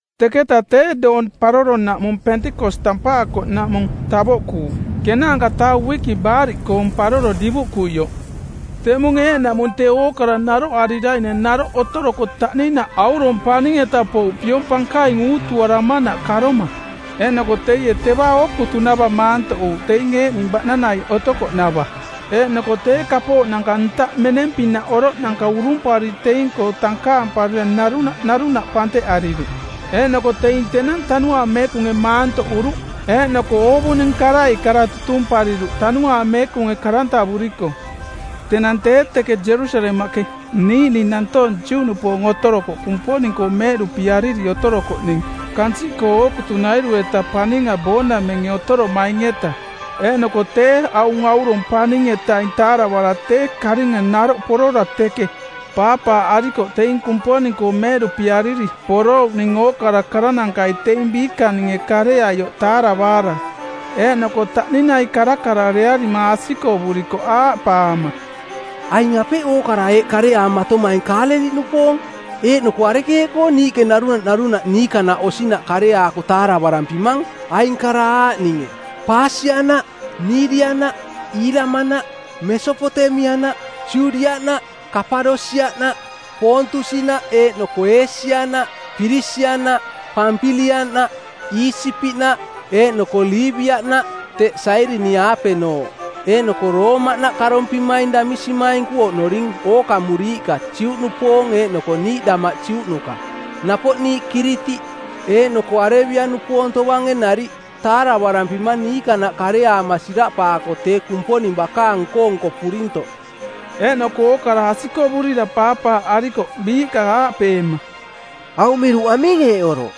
Teketa tee doong paroronaꞌmung Pentekos tampaakoꞌnaꞌmung tavoꞌkuuꞌ ˜kenaanka-taa uiki Baariꞌkoong˜ Paroro divuꞌkuioꞌ. Teꞌmung eeꞌnaꞌmung tee ookara naroꞌarira naroꞌ otoroko taꞌninaꞌ aurong paning-eta pouꞌ piong pankaing uutuarama karomanaꞌ. Eeꞌnoko teie teva ookutunava maantoꞌuuꞌ teing eeꞌning baꞌnanai otokoꞌnava. Eeꞌnoko tee kapooꞌnanka ntaꞌ meneng-pinaꞌ oroꞌnanka urumpariri teing-koo tankaamparira narunaꞌ narunaꞌ panteꞌariruꞌ. Eeꞌnoko teing tenang Tanuaang Meekunge maantoꞌuruꞌ, eeꞌnoko oovuning karai kara tutumpariruꞌ Tanuaang Meekunge karantavuriko˜. Tenang tee teke Jerusalemaꞌke niiꞌning nantoong Juꞌnupoong otorokoꞌ Kumponing-koo meeꞌduꞌpiariri otorokoꞌning kansiꞌkoo ookutunairu-eta paninga boonamenge otoromaing-eta. Eeꞌnoko tee aung aurong paning-etaing taaravaara tee karinga naroꞌ porora teke paapaaꞌarikoꞌ teing Kumponing-koo meeꞌduꞌpiariri porouꞌning ookara karanankai teing biikaninge kareaioꞌ taaravaara. Eeꞌnoko taꞌninai karakararearima asikovurikoꞌ aaꞌpaama, “Aing apeꞌ ookara eeꞌ kareaamatomaing Kaaleliꞌnupoong, eeꞌnoko arekeeꞌkoo niiꞌke narunaꞌ narunaꞌ niikanaꞌ osinaꞌ kareaako taaravarampimang, aing kara aaꞌninge: Paasiaꞌnaꞌ, Miidiaꞌnaꞌ, Iilamaꞌnaꞌ, Mesopotemiaꞌnaꞌ, Judiaꞌnaꞌ, Kapadosiaꞌnaꞌ, Poontusinaꞌ, eeꞌnoko Eesianaꞌ, Pirisiaꞌnaꞌ, Pampiliaꞌnaꞌ, Iisipiꞌnaꞌ, eeꞌnoko Liibiaꞌnaꞌ teꞌ Sairini-aapenooꞌ. Eeꞌnoko Roomaꞌnaꞌ karompimaing damisimainku oꞌnoring ookamuriiꞌka Juꞌnupoong eeꞌnoko niiꞌ damaꞌ Juꞌnuka. Napoꞌ niiꞌ Kiritiꞌ eeꞌnoko Arebia-nupoong tovange nariꞌ, taaravarampimang niikanaꞌ kareaama siraꞌpaako tee Kumponing bakaang nko-nko purintoꞌ.” Eeꞌnoko ookara asikovurira paapaaꞌarikoꞌ biiꞌka aaꞌpeema, “Aung miruꞌ aming eeꞌ oroꞌ?”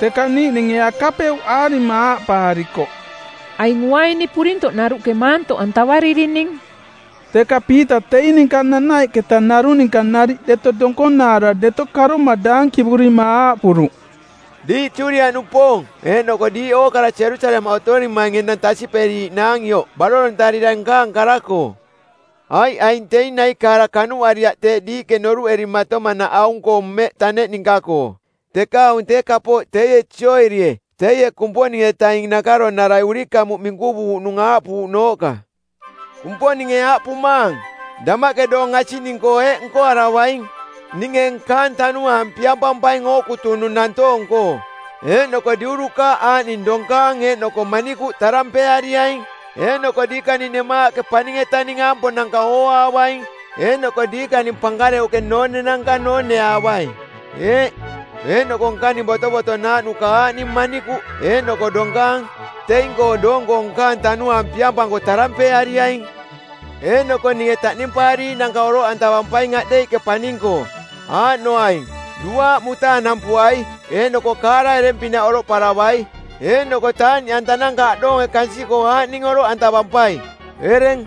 Teka niiꞌninge akapeuꞌaarima aaꞌpaarikoꞌ, “Aing uaini purintoꞌnaruꞌke maantoꞌantavaririning.” Teka Piita teing ninka nanaiꞌketa narung ninka nariꞌ deto donkonaara deto karoma daankivurima aaꞌpuruꞌ, “Diiꞌ Judiaꞌnupoong eeꞌnoko diiꞌ ookara Jerusalemaꞌ otorimaing enang tasiꞌperiiꞌnaang ioꞌ barorontarira nkaang kara-koo. Aiꞌ aing teing naikaara kanuꞌariaꞌ teeꞌ diiꞌke noruꞌerimatomanaꞌ aung-koo mmeꞌ taneꞌ ninka-koo. Teka aung tee kapooꞌ teie Jooelie teie Kumponing-etaing nakaronarai˜ urikamuꞌ minkuvuuꞌnung aaꞌpuuꞌnooꞌka, “Kumponinge aaꞌpumaang: Damaꞌke doong asiꞌning-koo eeꞌ nkoaravaing: Ninge nkaang Tanuaang piampampaing ookutunung nantoong-koo, eeꞌnoko diurukaaꞌ aaꞌning donkaang eeꞌnoko manikuꞌ tarampeeariaing˜ eeꞌnoko diikaning nemaaꞌke paning-etaning aampoonanka˜ ooaavaing eeꞌnoko diikaning pankareuꞌke noonenanka nooneaavai. Eeꞌ, eeꞌnoko nkaning botovotonaaꞌnuka aaꞌning manikuꞌ eeꞌnoko donkaang teing-koo doong-koo nkaang Tanuaang piampanko tarampeeariaing. Eeꞌnoko ninge taꞌnimpaariiꞌnanka oroꞌantavampaing aꞌdeiꞌke paning-koo, aaꞌnoaing: duaaꞌ mutaanampuai eeꞌnoko kaara ereng-pinaꞌ oroꞌparavai; Eeꞌnoko taaꞌniꞌantananka aꞌdoonge kansiꞌkoo aaꞌning oroꞌantavampai: ereng,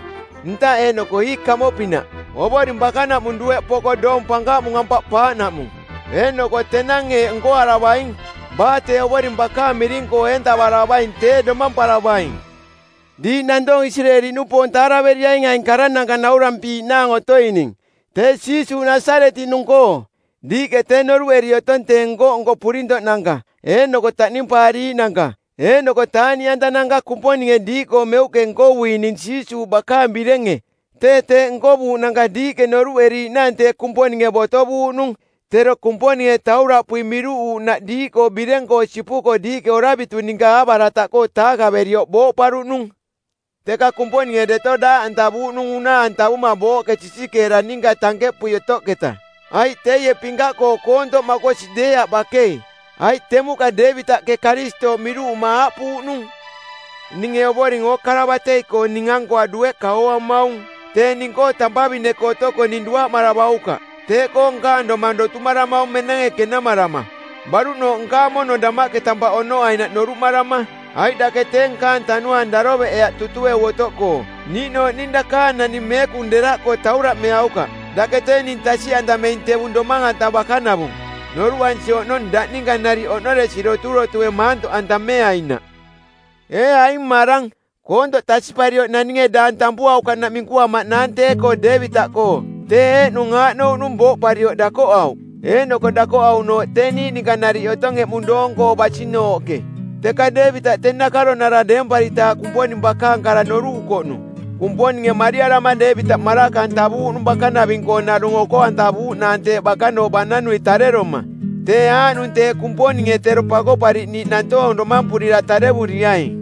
ntaꞌ eeꞌnoko ii kamoꞌpinaꞌ Ovoring bakanaꞌmung dueꞌ poko doong pankaꞌmung ampaꞌpaaꞌnaꞌmung. Eeꞌnoko tenang eeꞌ nkoaravaing: Baa tee Ovoring bakaang miring-koo eentavaravaing tee domamparavaing.’ “Diiꞌ nantoong Isireeli-nupoong taaraveriaing aing karananka naurampiiꞌnaang otoining, tee Jiisuuꞌ Nasaretiꞌnung-koo. Diiꞌke tee noruꞌeri otong tee nko-nko purintoꞌnanka eeꞌnoko taꞌnimpaariiꞌnanka eeꞌnoko taaꞌniꞌantananka Kumponinge diiꞌkoo meuꞌke nkovuining Jiisuuꞌ bakaang birenge. Tee teeꞌ nkovuuꞌnanka diiꞌke noruꞌeriiꞌnaang tee Kumponinge botovuuꞌnung. Tero Kumponinge tauraꞌpui miruꞌuuꞌnaꞌ diiꞌkoo bireng-koo sipuko diiꞌke oravitu ninka aaꞌbarataꞌkoo˜ taakaverioꞌ booꞌparuꞌnung. Teka Kumponinge deto daaꞌantavuuꞌnung unaa-antavuma booꞌke sisikeera ninka tankeꞌpui otoꞌketa, aiꞌ teie pinkaꞌkoo koontoꞌ makosi deeaꞌ bakei. Aiꞌ temuꞌka Deevitaꞌke Karistooꞌ miruꞌuma aaꞌpuuꞌnung, ‘Ninge Ovoring ookara batei-koo ning-ankoa dueꞌka ooamaung. Tee ning-koo tampavine-koo otoko ning duaꞌmaravaukaꞌ. Teeꞌkoo nkaang domang dotumaramaung menenge kenamarama, baruꞌnooꞌ nkaang mono damaꞌke tampaꞌ oꞌnoainaꞌ noruꞌmarama. Aiꞌ dake tee nkaang tanuaang daroveꞌeaꞌ tutueu otoꞌkoo, niiꞌnooꞌ ning dakaang naning meekung deraꞌkoo tauraꞌmeaukaꞌ. Dake tee ning tasiꞌantameing tevung domang-anta bakanavung. Noruꞌansi oꞌnong daꞌ ninka nariꞌ oꞌnoresi doturotue maantoꞌantameainaꞌ.’ “Ee aing mmarang, koontoꞌ tasiꞌparioꞌ naninge daang tampuaukaꞌnaꞌ minkuamaꞌnaang tee-koo Deevitaꞌkoo. Tee eeꞌnung aaꞌnouꞌnung booꞌparioꞌ dakoꞌauꞌ, eeꞌnoko dakoꞌauꞌnooꞌ tee niiꞌ ninka nariꞌ otong eꞌmung doong-koo basinooꞌke. Teka Deevitaꞌ tee nakaronara˜ deemparitaaꞌ Kumponing bakaang kara noruꞌukoꞌnung. Kumponinge mariarama Deevitaꞌ maraka-antavuuꞌnung bakanaving-koo narung oko-antavuuꞌnaang teꞌ bakanooꞌ baꞌnanui tareroma; tee aaꞌnung tee Kumponinge tero Pakoꞌpariꞌniiꞌ nantoong domampurira tarevuriaing.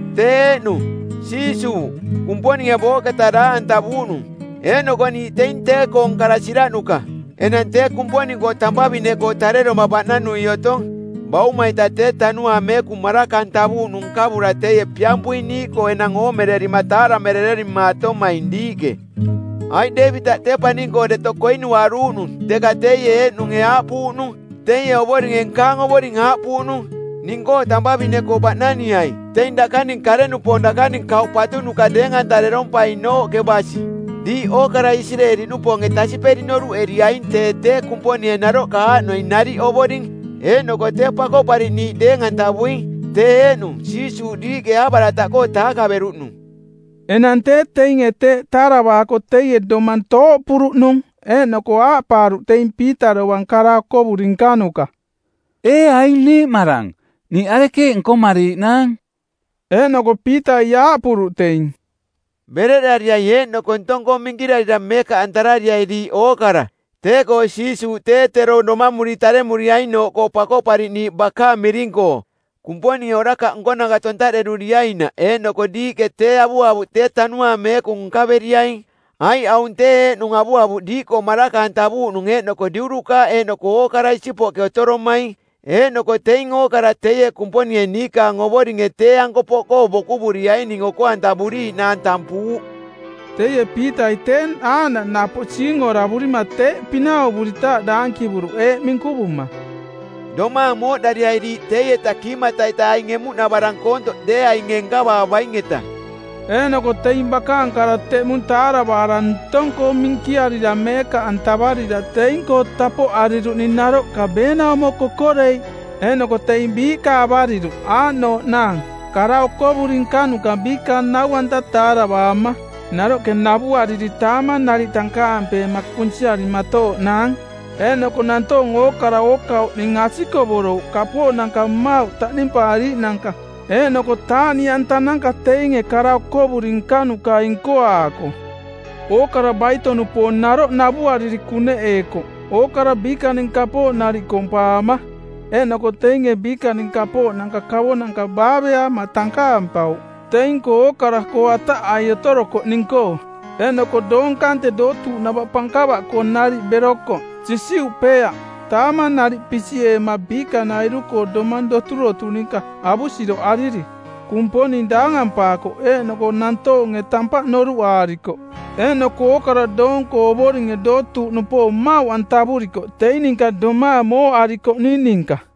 Tee eeꞌnung, Jiisuuꞌ, Kumponinge booꞌketa daaꞌantavuuꞌnung eeꞌnoko niiꞌ teing tee-koong kara siraꞌnuka. Enang tee Kumponing-koo tampavine-koo tareroma baꞌnanui otong. Bauma-ita tee Tanuaang Meekung maraka-antavuuꞌnung nkavura teie piampuing niiꞌkoo enang oomererima taaramerererimaatomaing diiꞌke. Aiꞌ Deevitaꞌ tee paning-koo deto koinuaruuꞌnung, teka teie eeꞌnunge aaꞌpuuꞌnung, ‘Teie Ovoringe nkaang Ovoring aaꞌpuuꞌnung, “Ning-koo tampavine-koo baꞌnaniai teing dakaning kare-nupoong dakaning kauꞌ patuꞌnuka deeng-antarerompainooꞌke basi.” ’ Diiꞌ ookarai Isireeli-nupoonge tasiꞌperi noruꞌeriaing tee tee Kumponinge naroꞌka aaꞌnoing nariꞌ Ovoring eeꞌnoko tee Pakoꞌpariꞌniiꞌ deeng-antavuing, tee eeꞌnung Jiisuuꞌ diiꞌke aaꞌbarataꞌkoo taakaveruꞌnung.” Enang tee teinge tee taaravaako teie domang tooꞌpuruꞌnung, eeꞌnoko aaꞌpaaruꞌ teing Piita dovang kara okovuri nkanuka, “Ee aing niiꞌmarang, niiꞌ arekeeꞌ nkomariiꞌnaang?” Eeꞌnoko Piitai aaꞌpuruꞌ teing, “Bereꞌdarira eeꞌnoko ntong-koo minkirarira meekaꞌantarariai diiꞌ ookara tee-koo Jiisuuꞌ tee tero domamuri taremuriainooꞌkoo Pakoꞌpariꞌniiꞌ bakaang miring-koo Kumponinge orakaꞌ nkonanka tontaꞌderuriainaꞌ eeꞌnoko diiꞌke tee avuavuꞌ tee Tanuaang Meekung nkaveriaing. Aiꞌ aung tee eeꞌnung avuavuꞌ diiꞌkoo maraka-antavuuꞌnung eeꞌnoko diurukaaꞌ eeꞌnoko ookara isipoꞌke otoromaing. Eeꞌnoko teing ookara teie Kumponinge niikaang Ovoringe tee-anko poꞌkoo bokuvuriaining oko-antavuriiꞌnaang tampuuꞌ.” Teie Piitai tee aaꞌnaꞌ napoꞌ siingoravurima teeꞌ pinauvuritaaꞌ daankivuruꞌ eeꞌ minkuvuma, “Domaang mooꞌdariai diiꞌ teieta kiimata-ita aing emuꞌnavarang koontoꞌ deeainge nkavaavaing-eta.” Eeꞌnoko teing bakaang kara teꞌmung taaravaara, ntong-koo minkiarira meekaꞌantavarira, teing-koo tapoꞌariruꞌning naroꞌka beenaumo kokoreiꞌ. Eeꞌnoko teing biiꞌka avariruꞌ aaꞌnooꞌnaang: kara okovuri nkanuka biikaang nau-anta taaravaama, naroꞌke navuariri, taamang nariꞌ tankaampeema kunsiarimatooꞌnaang. Eeꞌnoko nantoong ookara ookauꞌning asikovorouꞌ, kapooꞌnanka mmauꞌ taꞌnimpaariiꞌnanka eeꞌnoko taaꞌniꞌantananka teinge kara okovuri nkanukai nkoaako. Ookara baito-nupoong naroꞌ navuariri kuneꞌeekoꞌ ookara biikaning kapooꞌ nariꞌ kompaama. Eeꞌnoko teinge biikaning kapooꞌnanka kavonanka baaveaama tankaampauꞌ teing-koo ookara-koo ataꞌai otorokoꞌning-koo. Eeꞌnoko doong kante dootuuꞌnava pankava-koo nariꞌ berokoꞌ sisiuꞌpeeaꞌ, taamang nariꞌ pisiꞌeema biikanairu-koo domang doturotu ninka avusiroꞌariri. Kumponing daangampaakoꞌ, eeꞌnoko nantoonge tampaꞌ noruꞌaarikoꞌ. Eeꞌnoko ookara doong-koo Ovoringe dootuuꞌnupoong mmauꞌantavurikoꞌ teing ninka domaang mooꞌarikoꞌning ninka.